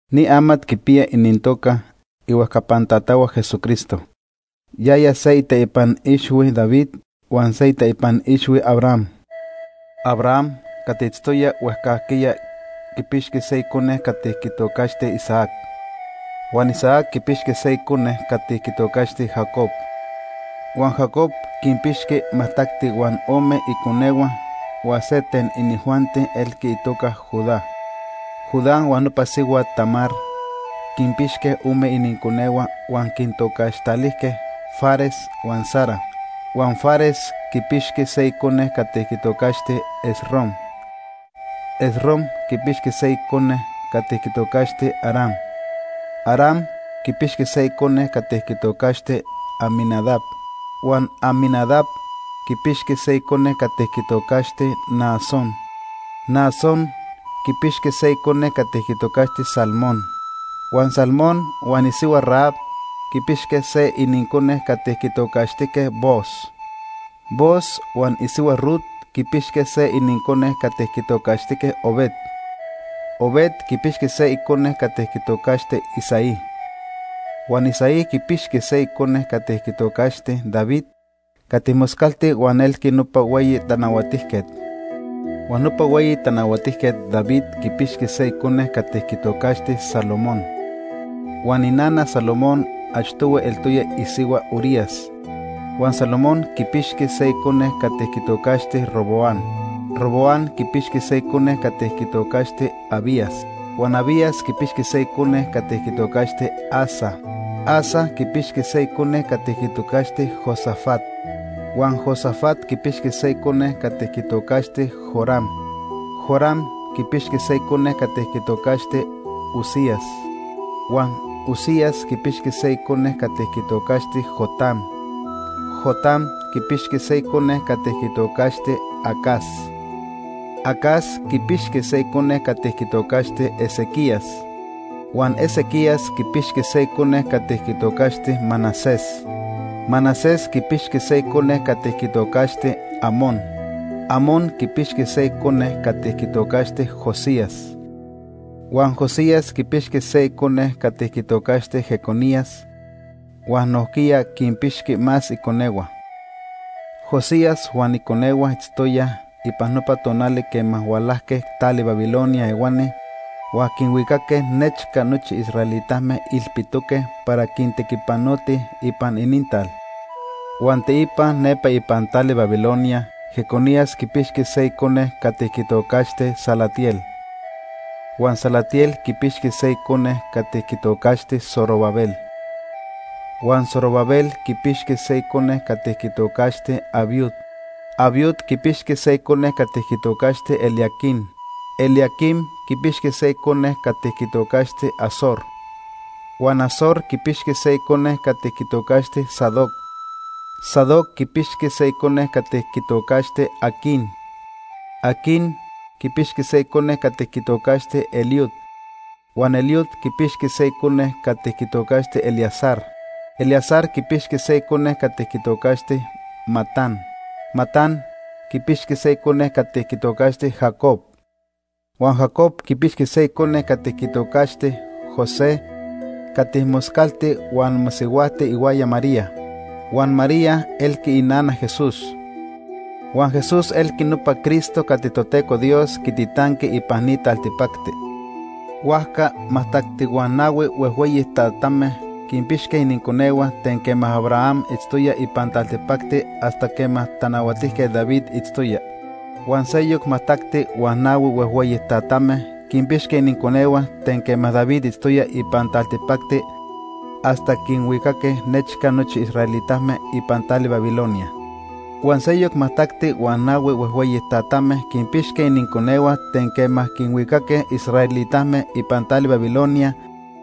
Ni amat quipiya inintoca ihuejcapan tatahua Jesucristo. Yaya se iteipan ixhui David huan se iteipan ixhui Abraham. Abraham cati itztoya huejcajquiya quipixqui se icone cati quitocaxti Isaac. Huan Isaac quipixqui se icone cati quitocaxti Jacob. Huan Jacob quinpixqui majtacti huan ome iconehua huan se ten inijuanti elqui itoca Judá. Judá huan nopa sihuat Tamar quinpixque ome ininconehua huan quintocaxtalijque Fares huan Zara. Huan Fares quipixqui se icone cati quitocaxti Esrom. Esrom quipixqui se icone cati quitocaxti Aram. Aram quipixqui se icone cati quitocaxti Aminadab. Huan Aminadab quipixqui se icone cati quitocaxti Naasón. Naasón quipixqui se icone cati quitocaxti Salmón. Huan Salmón huan isihua Rahab quipixque se inincone cati quitocaxtijque Booz. Booz huan isihua Rut quipixque se inincone cati quitocaxtijque Obed. Obed quipixqui se icone cati quitocaxti Isaí. Huan Isaí quipixqui se icone cati quitocaxti David cati moscalti huan elqui nopa hueyi tanahuatijquet. Huan nopa hueyi tanahuatijquet David quipixqui se icone cati quitocaxti Salomón. Huan inana Salomón achtohui eltoya isihua Urías. Huan Salomón quipixqui se icone cati quitocaxti Roboam. Roboam quipixqui se icone cati quitocaxti Abías. Huan Abías quipixqui se icone cati quitocaxti Asa. Asa quipixqui se icone cati quitocaxti Josafat. Huan Josafat quipixqui se icone cati quitocaxti Joram. Joram quipixqui se icone cati quitocaxti Uzías. Huan Uzías quipixqui se icone cati quitocaxti Jotam. Jotam quipixqui se icone cati quitocaxti Acaz. Acaz quipixqui se icone cati quitocaxti Ezequías. Huan Ezequías quipixqui se icone cati quitocaxti Manasés. Manasés quipixqui se icone cati quitocaxti Amón. Amón quipixqui se icone cati quitocaxti Josías. Huan Josías quipixqui se icone cati quitocaxti Jeconías, huan nojquiya quinpixqui más iconehua. Josías huan iconehua itztoyaj ipan nopa tonali quema hualajque tali Babilonia ehuani huan quinhuicaque nechca nochi israelitame ilpitoque para quintequipanotij ipan inintal. Huan teipa nepa ipan tali Babilonia Jeconías quipixqui se icone cati quitocaxti Salatiel. Huan Salatiel quipixqui se icone cati quitocaxti Zorobabel. Huan Zorobabel quipixqui se icone cati quitocaxti Abiud. Abiud quipixqui se icone cati quitocaxti Eliaquim. Eliaquim quipixqui se icone cati quitocaxti Azor. Huan Azor quipixqui se icone cati quitocaxti Sadoc. Sadoc quipixqui se icone cati quitocaxti Aquim. Aquim quipixqui se icone cati quitocaxti Eliud. Huan Eliud quipixqui se icone cati quitocaxti Eleazar. Eleazar quipixqui se icone cati quitocaxti Matán. Matán quipixqui se icone cati quitocaxti Jacob. Huan Jacob quipixqui se icone cati quitocaxti José cati moscalti huan mosihuajti ihuaya María. Huan María elqui inana Jesús. Huan Jesús elqui nopa Cristo cati Toteco Dios quititanqui ipan ni taltipacti. Huajca majtacti huan nahui huejhueyi tatame quinpixque ininconehua ten quema Abraham itztoya ipan taltipacti hasta quema Tanahuatijquet David itztoya. Huan seyoc majtacti huan nahui huejhueyi tatame quinpixque ininconehua ten quema David itztoya ipan taltipacti hasta quinhuicaque nechca nochi israelitame ipan tali Babilonia. Huan seyoc majtacti huan nahui huejhueyi tatame quinpixque ininconehua ten quema quinhuicaque israelitame ipan tali Babilonia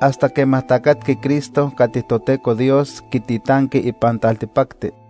hasta quema tacatqui Cristo cati Toteco Dios quititanqui ipan taltipacti.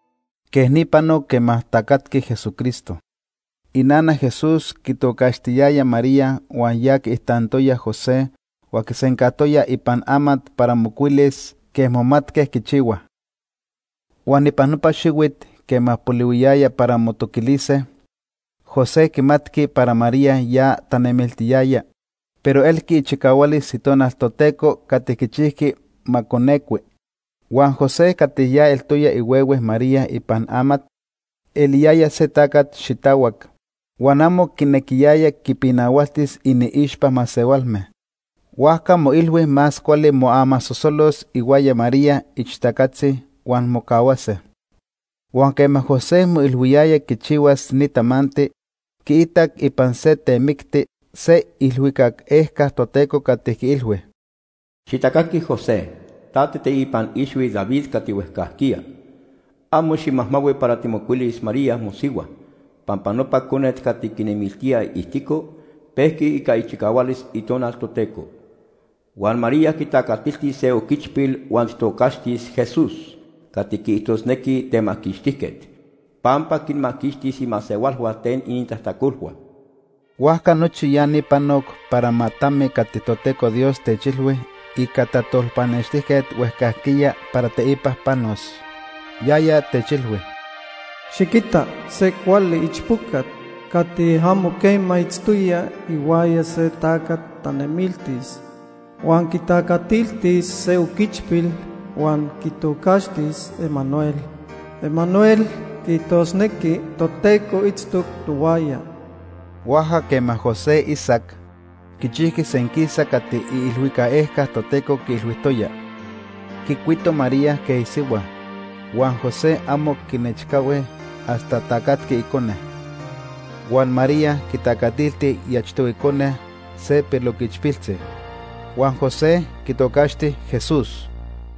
Quej ni panoc quema tacatqui Jesucristo. Inana Jesús quitocaxtiyayaj María huan ya quiijtantoya José huan quisencajtoyaj ipan amat para mocuilis quej momatque quichihuaj. Huan ipan nopa xihuit quema polihuiyaya para motoquilise, José quimatqui para María ya tanemiltiyaya, pero elqui ichicahualis Itonal Toteco cati quichijqui ma conecui. Huan José cati ya eltoya ihuehue María ipan amat, eliyaya se tacat xitahuac, huan amo quinequiyaya quipinahualtis iniixpa masehualme, huajca moilhui más cuali moamasosolos ihuaya María ixtacatzi huan mocahuase. Huan quema José moilhuiyaya quichihuas ni tamanti, quiitac ipan se temicti se iilhuicac ejca Toteco cati quiilhui: “Xitacaqui José, ta tiiteipan ixhui David cati huejcajquiya. Amo ximajmahui para timocuilis María, mosihua, pampa nopa conet cati quinemiltía iijtico, pejqui ica ichicahualis Itonal Toteco. Huan María quitacatiltis se oquichpil huan tijtocaxtis: ‘Jesús’ cati quiijtosnequi: ‘Temaquixtijquet’, pampa quinmaquixtis imasehualhua ten inintajtacolhua.” Huajca nochi ya ni panoc para ma tami cati Toteco Dios techilhui ica tajtolpanextijquet huejcajquiya para teipa panos. Yaya techilhui: “Xiquita se cuali ichpocat cati amo quema itztoya ihuaya se tacat tanemiltis, huan quitacatiltis se oquichpil huan quitocaxtis: Emanuel. Emanuel quiijtosnequi: ‘Toteco itztoc tohuaya.’” Huajca quema José isac, quichijqui senquisa cati iilhuicac ejca Toteco quiilhuijtoya. Quicuito María quej isihua, huan José amo quinechcahui hasta tacatqui icone. Huan María quitacatilti iachtohui cone, se piloquichpiltzi. Huan José quitocaxti Jesús.